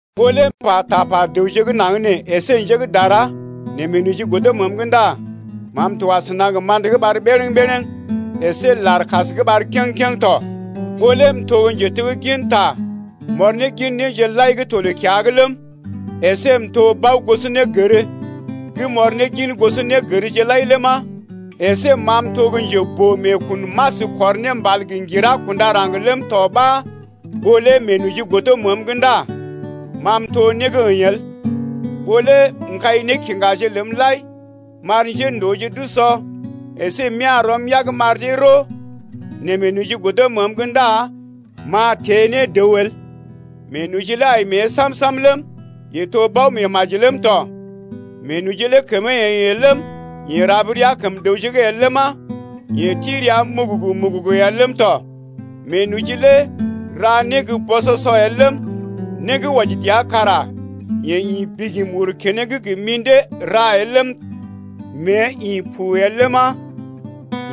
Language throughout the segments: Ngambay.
Ɓó lé m’pa tapa dəwje gə́ naŋg nee əsé njé gə́ dara nɛ meenoji godo məəm’g ndá ma m’to asəna gə ma̰də gə́ ɓar bərəŋ-bərəŋ əsé lar gə́ kas gə́ ɓar kèŋ-kèŋ tɔ. Ɓó lé m’to gə́ njetegginta m’ɔr ne gin néje lai gə́ to loo-kiya’g ləm, əsé m’to bao-gosonégər gə m’ɔr ne gin gosɔnégərje lai ləma, əsé ma m’to gə́ njeboo-meekun m’as kɔr ne mbal gə ŋgira kunda raŋg ləm tɔ ɓa ɓó lé meenoji godo məəm’g ndá ma m’to né gə́ əḭ el. Ɓó lé m’kai nékiŋgaje ləm lai m’ar njéndooje d’usɔ əsé m’ya̰ rɔm yag m’ar dee roo, nɛ meenoji godo məəm’g ndá m’a teḛ ne dəw el. Meenoji lé ai mée sam-sam ləm, yee to bao-meemaji ləm tɔ. Meenoji lé kəmee əḭ el ləm, yee rab rəa kəm dəwje’g el ləma, yee ti rəa mugugu-mugugu el ləm tɔ. Meenoji lé ra né gə́ bɔsɔsɔ el ləm, né gə́ wɔji dəa kara yee ḭ bigim kuru keneŋ gə mḭdé ra el ləm, mée ḭ pu el ləma,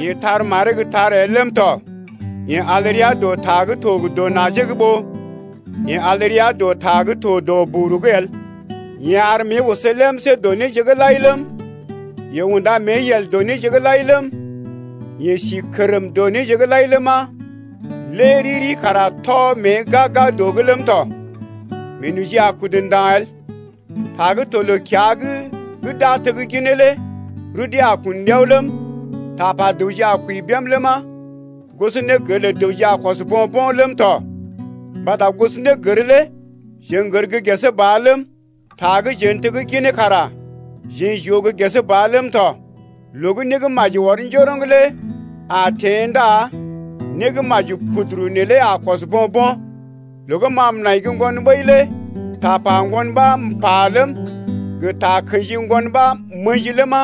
yee tar maree gə́ tar el ləm tɔ. Yee al rəa dɔ ta gə́ to gə dɔ najee’g ɓó yee al rəa dɔ ta gə́ to dɔ buguru’g el. Yee ar mée oso lemsé dɔ néje’g lai ləm, yee unda mée yel dɔ néje’g lai ləm, yee si kərm dɔ néje’g lai ləma, lé riri kara tɔ mée gag-gag dɔ’g ləm tɔ. Meenoji a kudu ndaŋg el. Ta gə́ to loo-kiya’g gə́ d’a tegginee lé rudee a kun ɗiao ləm, tapa dəwje a kwəi bém ləma, gosonégər lə dəwje a kɔs bo̰-bo̰ ləm tɔ. Mbata gosonégər lé jeḛ n’gər gə́ gesee ba ləm, ta gə́ jeḛ n’tegginee kara jeḛ j’oo gə́ gesee ba ləm tɔ. Loo gə́ né gə́ maji ɔr njoroŋ lé a teḛ ndá né gə́ maji puduru neelé a kɔs bo̰-bo̰. Loo gə́ ma m’nai gə́ ŋgon ɓəi lé tapa ŋgon ɓa m’pa ləm, gə takə̰ji ŋgon ɓa m’ə̰ji ləma,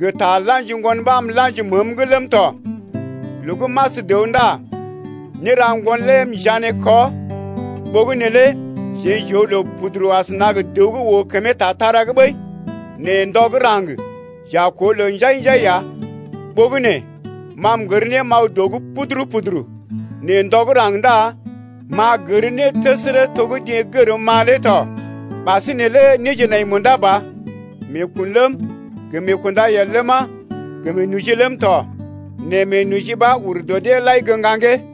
gə ta la̰ji ŋgon ɓa m’la̰ji məəm’g ləm tɔ. Loo gə́ m’as dəw ndá néra ŋgon lé m’njané kɔ. Ɓogənè lé jeḛ j’oo loo puduru asəna gə dəw gə́ oo kəmee tatara’g ɓəi, nɛ ndɔ gə́ raŋg j’a koo loo njai-njai ya. Ɓogənè ma m’gər né m’aw dɔ’g puduru-puduru, nɛ ndɔ gə́ raŋg ndá m’a gər né təsərə to gə́ deḛ gərm ma lé tɔ. Ɓasinè lé néje nai munda ba: Meekun ləm, gə meekundayel ləma, gə meenoji ləm tɔ: nɛ meenoji ɓa ur dɔ deḛ lai gə́ ŋgaŋgee.